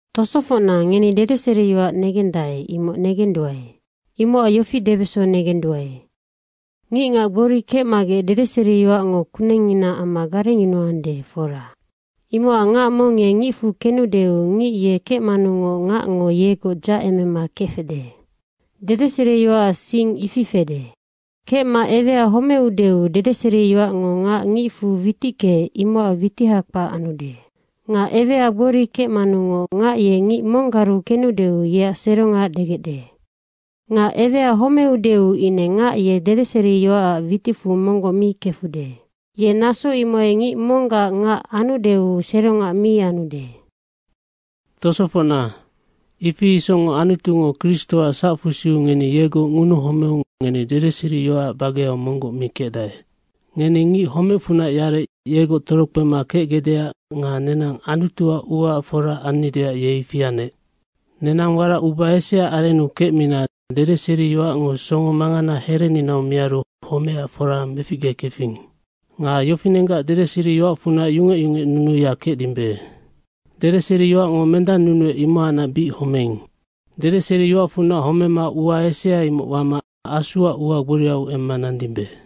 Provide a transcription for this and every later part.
Tosofocna, ngeni dedeseriyoac negendae, imoc negenduae. Imocac yofi debeso negenduae. Ngicngac gbori kecmagec dedeseriyoacngo kunengngina amma garengyunuande, fora. Imocac ngac mong ye ngicfu kenudeu, ngic ye kecmanungoc ngacngo yegoc dzahacemema kefecde. Dedeseriyoacac sing ifi fede. Kecma ewea homeudeu dedeseriyoacngo ngac ngicfu witickeec, imocac witiha kpac anude. Nga ewea gbori kecmanungoc ngac ye ngic monggaru kenudeu yeac serongac degecde. Nga ewea homeudeu ine ngac ye dedeseriyoacac witicfu monggoc mi kefude. Ye naso imohai ngic monggac ngac anudeu serongac mi anude. Tosofocna, ifi isocngoc Anutungo Kristoac sacfusiu ngeni yegoc ngunuhomeu ngeni dedeseriyoacac bageau monggoc mi kecdae. Ngeni ngic homecfunac yarec, yegoc torokpema kecgecdeac nga nenang Anutuac uaac fora annideac ye ifi anec. Nenang warac uba eseaac arennu kecmina dedeseriyoacngo songo mangana herenina miaru homecac fora meficgekefing. Nga yofinenggac dedeseriyoacfunac yungec yungecnunuya kecdimbe. Dedeseriyoacngo mendannunuec, imohacnac bic homeing. Dedeseriyoacfunac homema ua esea imoc wama Asuac ua gboriau emma nandimbe.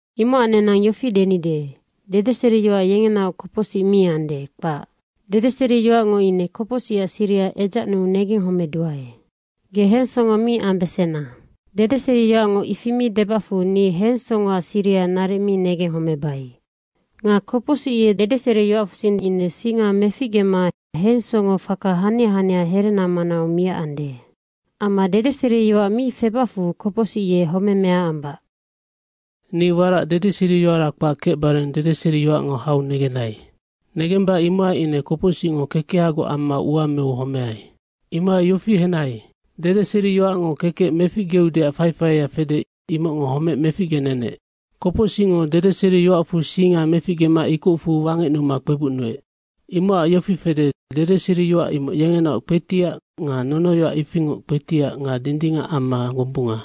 Imocac nenang yofi denide, dedeseriyoac yengenaoc kopocsic mi ande, kpac. Dedeseriyoacngo ine kopocsicac siriha edzacnuu negenghomeduae. Ge hensongo mi ambesena. Dedeseriyoacngo ifi mi debacfu ni hensongoac siriha naric mi negenghomebai. Nga kopocsic ye dedeseriyoacfusing ine singa meficgema hensongofaka hania hania herena manau miacande. Amma dedeseriyoac mi febacfu, kopocsic ye homemea ambac. Ni warac dedeseriyoara kpac kecbare dedeseriyoacngo hau negenai. Negemba imohai ine kopocsicngo kekehagoc amma ua meu homeai. Imohai yofi henai, dedeseriyoacngo kekec meficgeudeac faifaia fede, imocngonoc homec meficgenenec. Kopocsicngo dedeseriyoacfu singa meficgema ikocfu wangecnuma kpebucnuec. Imocac yofi fede, dedeseriyoac imoc yengenaoc kpetiac nga nonoyoac ifingoc kpetiac nga dindingac amma gombunga.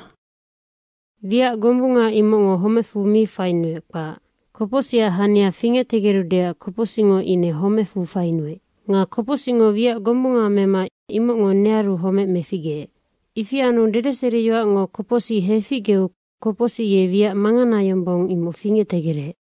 Wiac gombunga, imocngo homecfu mi fainuec, kpac. Kopocsicac hania fingectegerudeac kopocsicngo ine homecfu fainuec. Nga kopocsicngo wiac gombunga mema imocngo nearu homec meficgeec. Ifi anu dedeseriyoacngo kopocsic heficgeu kopocsic ye wiac mangana yombong, imoc fingectegerec.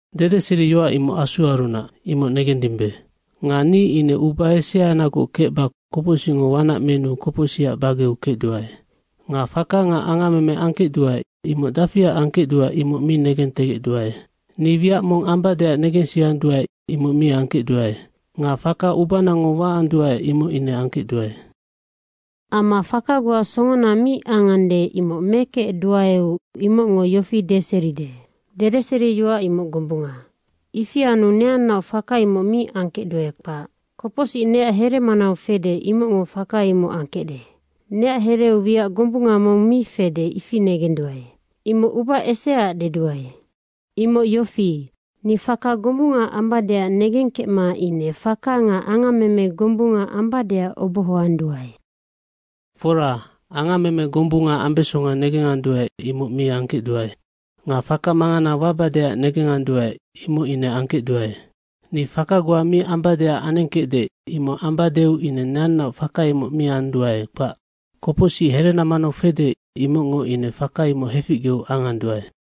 Dedeseriyoac imoc Asuarunac, imoc negendimbe. Nga ni ine uba eseanagoc kecba kopocsicngo wanac menuu, kopocsicac bageu kecduae. Nga faka nga angammeme angkecduae, imoc dafiac angkecduae, imoc mi negentegecduae. Ni wiac mong ambadeac negensianduae, imoc mi angkecduae. Nga faka ubanango waanduae, imoc ine angkecduae. Amma faka goa songona mi angande, imoc mekecduaeu imocngo yofi deseride, dedeseriyoac imoc gombunga. Ifi anu neannaoc faka imoc mi angkecduae, kpac. Kopocsic neac here manau fede, imocngo faka imoc angkecde. Neac hereu wiac gombunga mong mi fede, ifi negenduae, imoc uba eseaac deduae. Imoc yofi, ni faka gombunga ambadeac negengkecma ine faka nga angammeme gombunga ambadeac obohoanduae. Fora, angammeme gombunga ambesonga negenganduae, imoc mi angkecduae. Nga faka mangana wabadeac negenganduae, imoc ine angkecduae. Ni faka goa mi ambadeac anengkecde, imoc ambadeu ine neannaoc faka imoc mi anduae, kpac. Kopocsic herena manau fede, imocngo ine faka imoc heficgeu anganduae.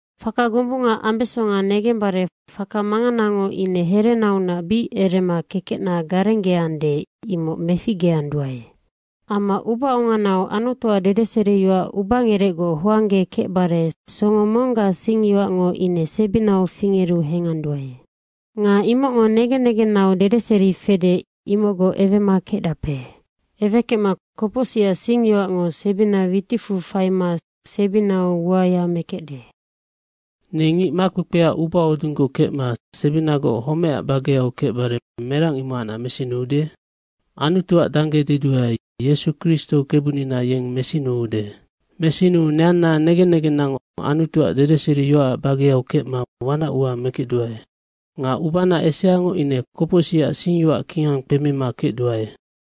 Faka gombunga ambesonga negembare faka manganango ine herenaunac bic erema kekecna garenggeande, imoc meficgeanduae. Amma ubaonganau Anutuac dedeseriyoac ubangerecgoc hoanggekecbare songo monggac singyoacngo ine sebinau fingeru henganduae. Nga imocngo negen negennau dedeseri fede, imocgoc ewema kecdape. Ewekecma kopocsicac singyoacngo sebina witicfu faima sebinau uaya mekecde. Ni ngic makpekpea ubahodunggoc kecma sebinagoc homecac bageau kecbare merang imohacnac mesinuude? Anutuac dangge deduae, Yesu Kristo Kebunina yeng mesinuude. Mesinuu neanna negen negennango Anutuac dedeseriyoacac bageau kecma wanac ua mekecduae nga ubana eseango ine kopocsicac singyoac kingang kpemima kecduae.